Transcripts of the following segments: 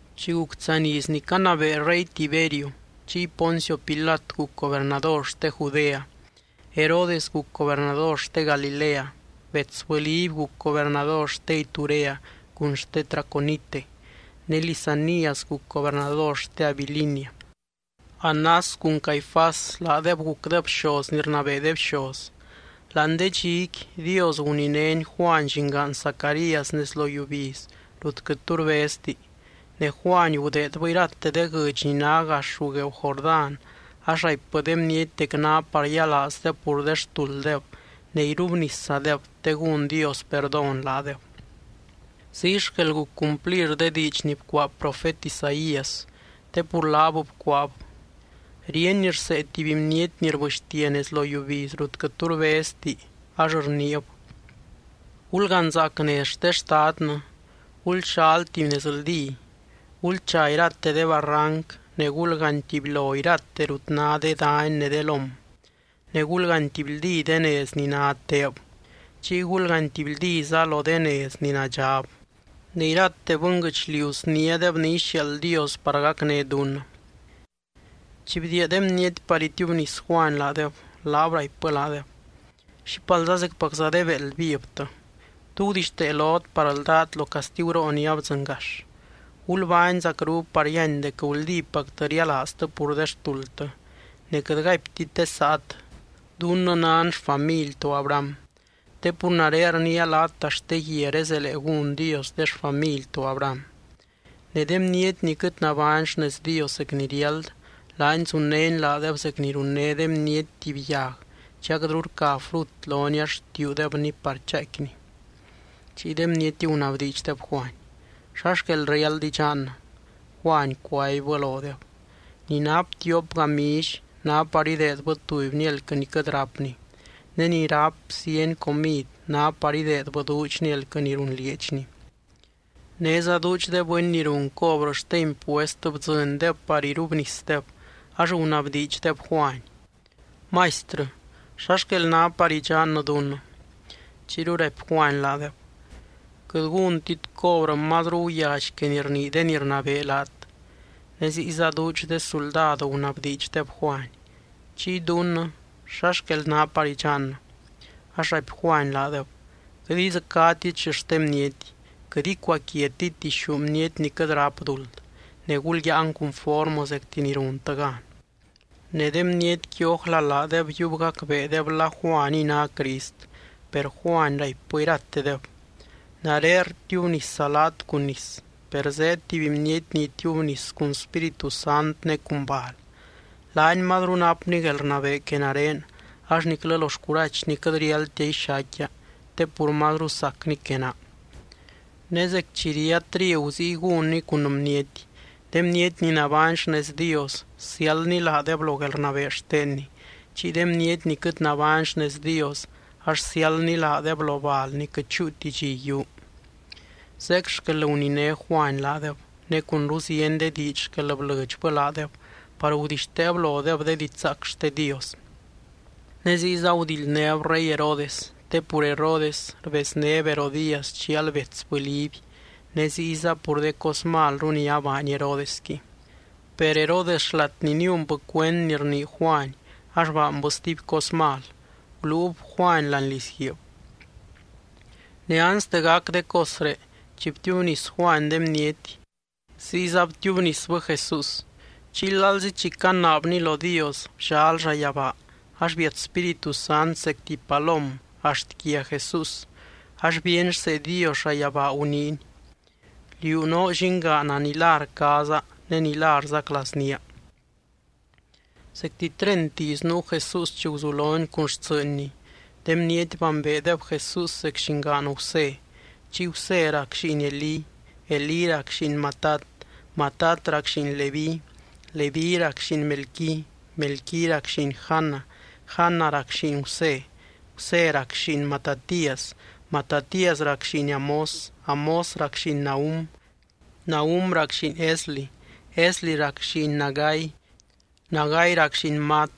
Chi guc tsaany iz ni canabee rey Tiberio, chiy Poncio Pilat guc gobernador xte Judea, Herodes guc gobernador xte Galilea, betsbɨ Liby guc gobernador xte Iturea cun xte Traconite, ne Lisanias guc gobernador xte Abilinia. Anás cun Caifás laadeb gucdeb bxoz ni rnabee de bxoz. Láani de dxiqui, Dios guninény Juany llingaan Zacarías nez lo yiubiz rut quɨt tu rbezti. Ne Juany gudeedbɨ irate de guɨdx ni ná gax ruu gueeu Jordán ax raipbɨ de bniety dec ná par yialaazdeb pur de xtulddeb ne irubniszadeb te gún Dios perdón laadeb. Ziy xquel guc cumplir de diidx ni bcuaa profet Isaías, te pur laab bcuaab: Ríeny rsee tuby bniety ni rbɨxtia nez lo yiubiz rut quɨt tu rbezti ax rniib: “Gulganzaac nez xte Xtadnɨ. Gulxal tuby nezldí. Gulcha irate de barranc ne gulgaany tubylo irate rut ná de dany ne de lóm, ne gulgaany tibyldí de nez ni ná teeb. Chiy gulgaany tibyldíza lo de nez ni nadxab. Ne irate bɨnguɨchliu sniádeb ni ixiaald Dios par gacné dunnɨ.” Chi bdiia de bniety par itiubnis Juany laadeb, laab raipbɨ laadeb: —¡Xípalza zecpacza de béeld vivtɨ! ¿Tú gudixtee lot par ldát lo castiguroo ni abdzɨngax? Gulbány zacru par yíany dec guldípactɨ rialaaztɨ pur de xtuldtɨ. Ne quɨt gaiptit de saat: “Dunnɨ nan xfamily to Abraham”, te pur nare rniia laat axt de guiaré zelee gún Dios de xfamily to Abraham. Ne de bniety ni quɨt nabány xnez Dios zec ni riáld, laany zunnény laadeb zec ni runné de bniety tuby yag chi aquɨtru rca frut loni ax rtiuudebni par chaaicquini. Chiy de bniety gunabdiidxdeb Juany: —¿Xa xquel riáld idxannɨ? Juany cuaibbɨ lodeb: —Ni nap tiop gamilly, ná par ideedbɨ tubyni elquɨ ni quɨt rápni. Ne ni ráp zieny comid, ná par ideedbɨ duudxni elquɨ ni runlieedxni. Néza duudx de bɨny ni run cobrɨ xte impuest bdzɨndeb par irubnisdeb, ax gunabdiidxdeb Juany: —Maistrɨ, ¿xa xquel ná par idxannɨ dunnɨ? Chiyru raipy Juany laadeb: —Quɨt gúntit cobrɨ mazru guyally que ni rnii de ni rnabee laat. Ne ziyza duudx de suldad gunabdiidxdeb Juany: —Chiy dunnɨ, ¿xa xquel ná par idxannɨ? Ax raipy Juany laadeb: —Quɨt idzɨcátit xixten bniety, quɨt icuaquiatit dixú bniety ni quɨt ráp duld. Ne gulyáan cunformɨ zecti ni runtɨ gan. Ne de bnietqui ójla laadeb yiub gacbeedeb la Juaniy ná Crist. Per Juany raipbɨ iratedeb: —Nare rtiubnisa laat cun nis. Per zeed tuby bniety ni itiubnis cun Spíritu Sant ne cun bal. Laany mazru napny guelrnabee que nare, ax niclɨ lo xcurachny quɨt riáldtia ixaicquia te pur mazru sacny que naa. Ne zec chi ría trigu ziy gúnny cun bniety. De bniety ni nabány xnez Dios siáldny laadeb lo guelrnabee xtenny. Chiy de bniety ni quɨt nabány xnez Dios ax siáldny laadeb lo bal ni quɨt chúuti dxi yiuu. Zeec xquel guniné Juany laadeb, ne cunru zieny de diidx xquel blɨdxbɨ laadeb par gudixteeb lodeb de didxzaac xte Dios. Ne ziyza gudildnéb rey Herodes, te pur Herodes rbeznéb Herodías chial betsbɨ Liby ne ziyza pur de cos malru ni abaany Herodesqui. Per Herodes xlat ni niunbɨ cuend ni rnii Juany ax baanbɨ stuby cos mal: guluub Juany láani lizguiib. Ne anste gac de cosré, chi btiubnis Juany de bniety, ziyza btiubnisbɨ Jesús. Chiy lalzi chi canaabny lo Dios, bllal llayabaa ax biat Spíritu Sant zec tuby palom axt quia Jesús ax bíeny rsee Dios llayabaa guniiny: —Liú noo Llingaana ni la rcaaza ne ni la rzaclaaznía. Zecti treint iz nuu Jesús chi guzulony cun xtsɨɨnny. De bniety bambeedeb Jesús zec llingaan Gusé. Chiy Gusé rac lliin Elí. Elí rac lliin Matat, Matat rac lliin Leví, Leví rac lliin Melqui, Melqui rac lliin Jana, Jana rac lliin Gusé, Gusé rac lliin Matatías, Matatías rac lliin Amós, Amós rac lliin Nahum, Nahum rac lliin Esli, Esli rac lliin Nagai, Nagai rac lliin Maat,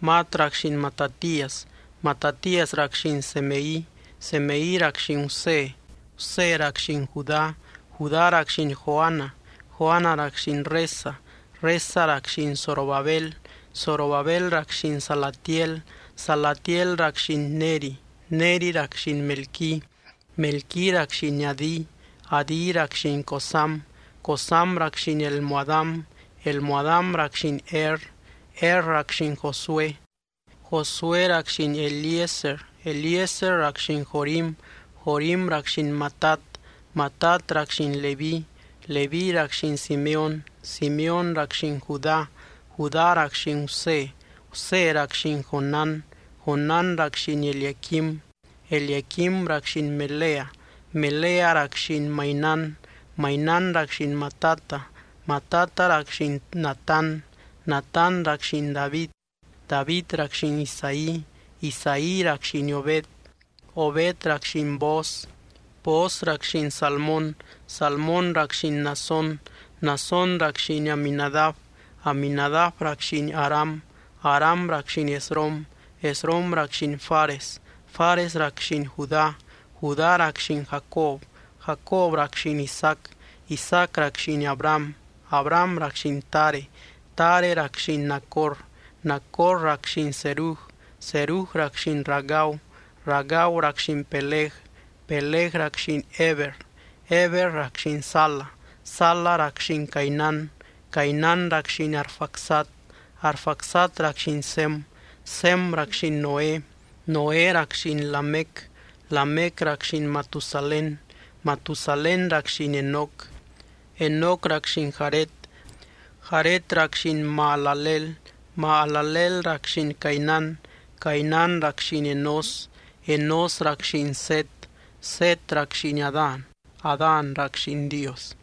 Maat rac lliin Matatías, Matatías rac lliin Semei, Semei rac lliin Gusé, Gusé rac lliin Judá, Judá rac lliin Joana, Joana rac lliin Resa, Resa rac lliin Zorobabel, Zorobabel rac lliin Salatiel, Salatiel rac lliin Neri, Neri rac lliin Melqui, Melqui rac lliin Adi, Adi rac lliin Cosam, Cosam rac lliin Elmodam, Elmodam rac lliin Er, Er rac lliin Josué, Josué rac lliin Eliezer, Eliezer rac lliin Jorim, Jorim rac lliin Matat, Matat rac lliin Leví, Leví rac lliin Simeóny, Simeóny rac lliin Judá, Judá rac lliin Gusé, Gusé rac lliin Jonán, Jonán rac lliin Eliaquim, Eliaquim rac lliin Melea, Melea rac lliin Mainán, Mainán rac lliin Matata, Matata rac lliin Natán, Natán rac lliin David, David rac lliin Isaí, Isaí rac lliin Obed, Obed rac lliin Booz, Booz rac lliin Salmón, Salmón rac lliin Naasón, Naasón rac lliin Aminadab, Aminadab rac lliin Aram, Aram rac lliin Esrom, Esrom rac lliin Fares, Fares rac lliin Judá, Judá rac lliin Jacob, Jacob rac lliin Isaac, Isaac rac lliin Abraham, Abraham rac lliin Tare, Tare rac lliin Nacor, Nacor rac lliin Serug, Serug rac lliin Ragau, Ragau rac lliin Peleg, Peleg rac lliin Heber, Heber rac lliin Sala, Sala rac lliin Cainán, Cainán rac lliin Arfaxad, Arfaxad rac lliin Sem, Sem rac lliin Noé, Noé rac lliin Lamec, Lamec rac lliin Matusalén, Matusalén rac lliin Enoc, Enoc rac lliin Jared, Jared rac lliin Mahalaleel, Mahalaleel rac lliin Cainán, Cainán rac lliin Enós, Enós rac lliin Set, Set rac lliin Adán, Adán rac lliin Dios.